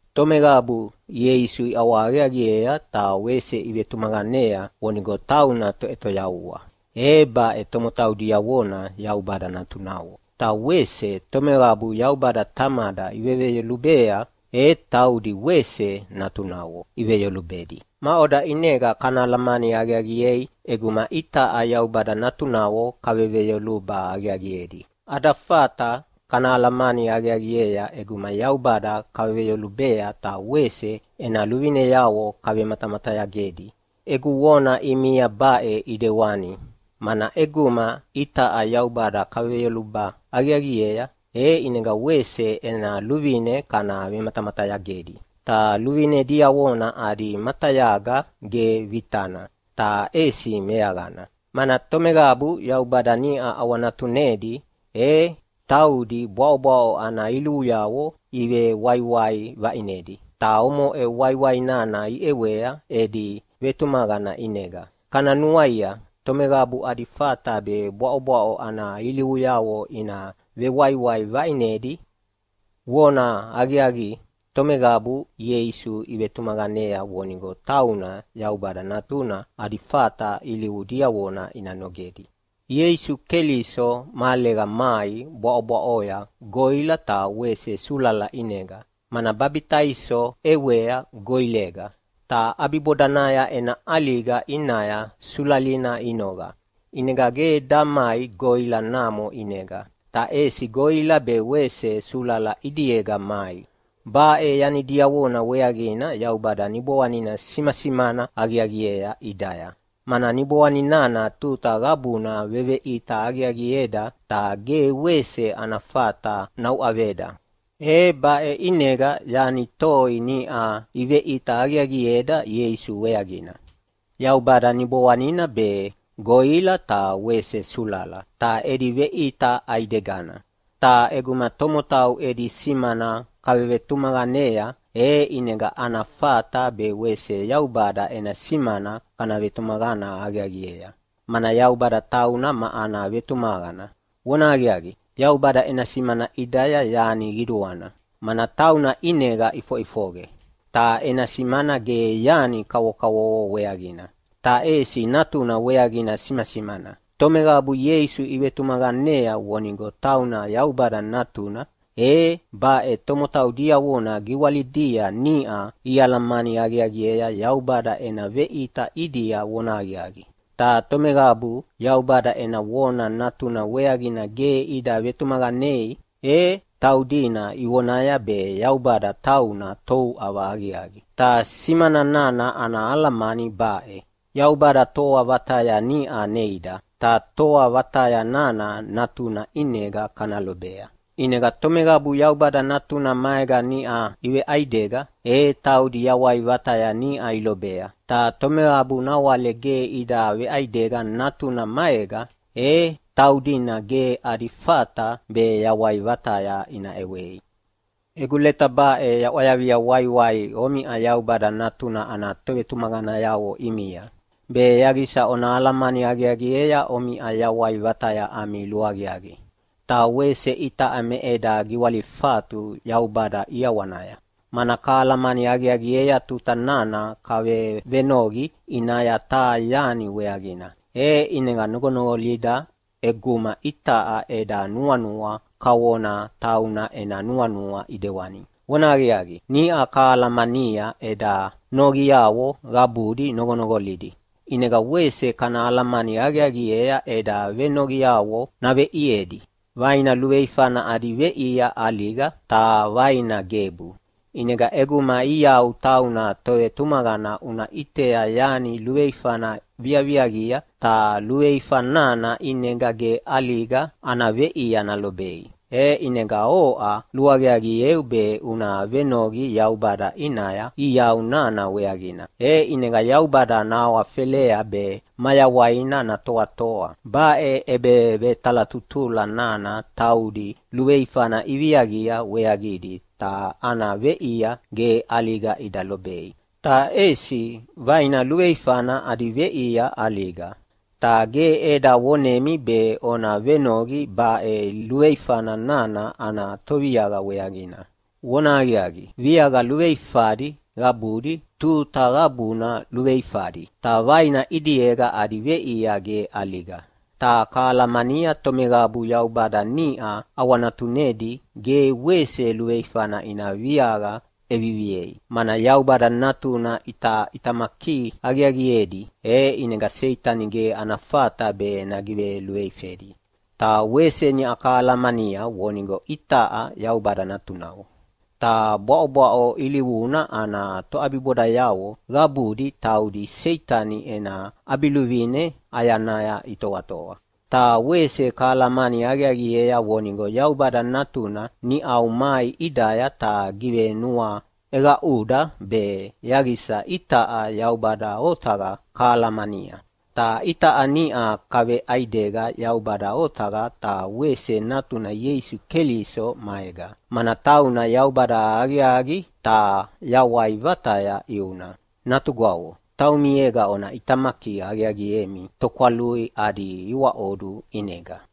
Tomeqabu Ieisu iʼawahaqiaqiea ta wese ivetumaqanea vonigo tauna Toʼetoyavua, e baʼe tomotau diavona Yaubada natunavo. Ta wese tomeqabu Yaubada Tamada iveveyolubea, e taudi wese natunavo iveveyolubedi. Maʼoda ʼinega kana alamani aqiaqiei ʼeguma itaʼa Yaubada natunavo kaveveyoluba aqiaqiedi? Ada fata kana alamani aqiaqiea ʼeguma Yaubada kaveveyolubea ta wese ena luvineavo kavematamatayagedi. Egu vona ʼimia baʼe ʼidewanina mana ʼeguma itaʼa Yaubada kaveveyoluba aqiaqiea, e ʼinega wese ena luvine kana vematamatayagedi. Ta luvine diavona adi matayaga ge vitana, ta ʼesi meaqana, mana tomeqabu Yaubada niʼa ʼawanatunedi e taudi bwaʼobwaʼo ana ilivuyavo ivewaiwai vaʼinedi. Ta omoʼe waiwai nana iʼewea edi vetumaqana ʼinega. Kana nuaia, tomeqabu adi fata be bwaʼobwaʼo ana ilivuyavo ina vewaiwai vaʼinedi? Vonahaqiaqi, tomeqabu Ieisu ivetumaqanea vonigo tauna Yaubada Natuna adi fata ilivu diavona ina nogedi. Ieisu Keliso mahalega mai bwaʼobwaʼoya goʼila ta wese sulala ʼinega, mana babitaiso ʼewea goʼilega, ta ʼabibodanaya ena ʼaliga ʼinaya sulalina inoqa. ʼInega ge damai goʼila namo ʼinega, ta ʼesi goʼila be wese sulala ʼidiega mai. Baʼe yani diavona weaqina Yaubada Niboanina simasimana aqiaqiea ʼidaya, mana Niboanina tuta qabuna veveʼita aqiaqieda ta ge wese ana fata nauʼaveda. E baʼe ʼinega yani toi niʼa iveʼita aqiaqieda Ieisu weaqina: Yaubada Niboanina be, goʼila ta wese sulala, ta edi veʼita ʼaidegana. Ta ʼeguma tomotau edi simana kavevetumaqanea, e ʼinega ana fata be wese Yaubada ena simana kana vetumaqana aqiaqiea, mana Yaubada tauna ma ana vetumaqana. Vonahaqiaqi, Yaubada ena simana ʼidaya yani qiduana, mana tauna ʼinega ʼifoʼifoqe, ta ena simana ge yani kavokavovo weaqina, ta ʼesi Natuna weaqina simasimana. Tomeqabu Ieisu ivetumaqanea vonigo tauna Yaubada Natuna, e baʼe tomotau diavona giwalidia niʼa ialamani aqiaqiea Yaubada ena veʼita ʼidia vonahaqiaqi. Ta tomeqabu Yaubada ena vona Natuna weaqina ge ida vetumaqanei, e taudina ivonaya be Yaubada tauna touʼava aqiaqi. Ta simana nana ana alamani baʼe: Yaubada toa vataya niʼa neida, ta toa vataya nana Natuna ʼinega kana lobea. ʼInega tomeqabu Yaubada Natuna maega niʼa iveʼaidega, e taudi yawai vataya niʼa ilobea. Ta tomeqabu nawale ge ida veʼaidega Natuna maega, e taudina ge adi fata be yawai vataya ina ʼewei. Egu leta baʼe yaʼwayavia waiwai omiʼa Yaubada Natuna ana tovetumaqanayavo ʼimia, be yaqisa ona alamani aqiaqiea omiʼa yawai vataya ami luaqiaqi. Ta wese itaʼa me eda giwalifatu Yaubada ʼiawanaya, mana kalamani aqiaqiea tuta nana kavevenoqi ʼinaya taha yani weaqina, e ʼinega noqonoqolida ʼeguma itaʼa eda nuanua kavona tauna ena nuanua ʼidewani. Vonahaqiaqi, niʼa kahalamania eda noqiavo qabudi noqonoqolidi, ʼinega wese kana alamani aqiaqiea eda venoqiavo naveʼiedi. Vaina luveifana adi veʼia ʼaliga ta vaina gebu. ʼInega ʼeguma iau tauna tovetumaqana una ʼitea yani luveifana viaviaqia, ta luveifa nana ʼinega ge ʼaliga ana veʼia nalobei, e ʼinega oʼa luaqiaqieu be una venoqi Yaubada ʼinaya iau nana weaqina, e ʼinega Yaubada nahawafelea be mayawaina natoatoa. Baʼe ʼebevetalatutula nana taudi luveifana iviaqia weaqidi ta ana veʼia ge ʼaliga ida lobei. Ta ʼesi vaina luveifana adi veʼia ʼaliga. Ta ge eda vonemi be ona venoqi baʼe luveifa nana ana toviaqa weaqina. Vonahaqiaqi, viaqa luveifadi qabudi tuta qabuna luveifadi, ta vaina ʼidiega adi veʼia ge ʼaliga. Ta kahalamania tomeqabu Yaubada niʼa ʼawanatunedi ge wese luveifana ina viaqa ʼeviviei, mana Yaubada Natuna ʼitaʼitamaki aqiaqiedi, e ʼinega Seitani ge ana fata be nagiveluveifedi. Ta wese niʼa kahalamania vonigo itaʼa Yaubada natunavo, ta bwaʼobwaʼo ilivuna ana toʼabibodayavo qabudi taudi Seitani ena ʼabiluvine ʼayanaya itoatoa. Ta wese kahalamani aqiaqiea vonigo Yaubada Natuna niʼau mai ʼidaya ta givenuaʼeqaʼuda be yaqisa itaʼa Yaubada otaqa kahalahalamania. Ta itaʼa niʼa kaveʼaidega Yaubada otaqa ta wese Natuna Ieisu Keliso maega, mana tauna Yaubada aqiaqi, ta yawai vataya ʼiuna. Natugwavo, taumiega ona ʼitamaki aqiaqiemi tokwalui adi iwaʼodu ʼinega.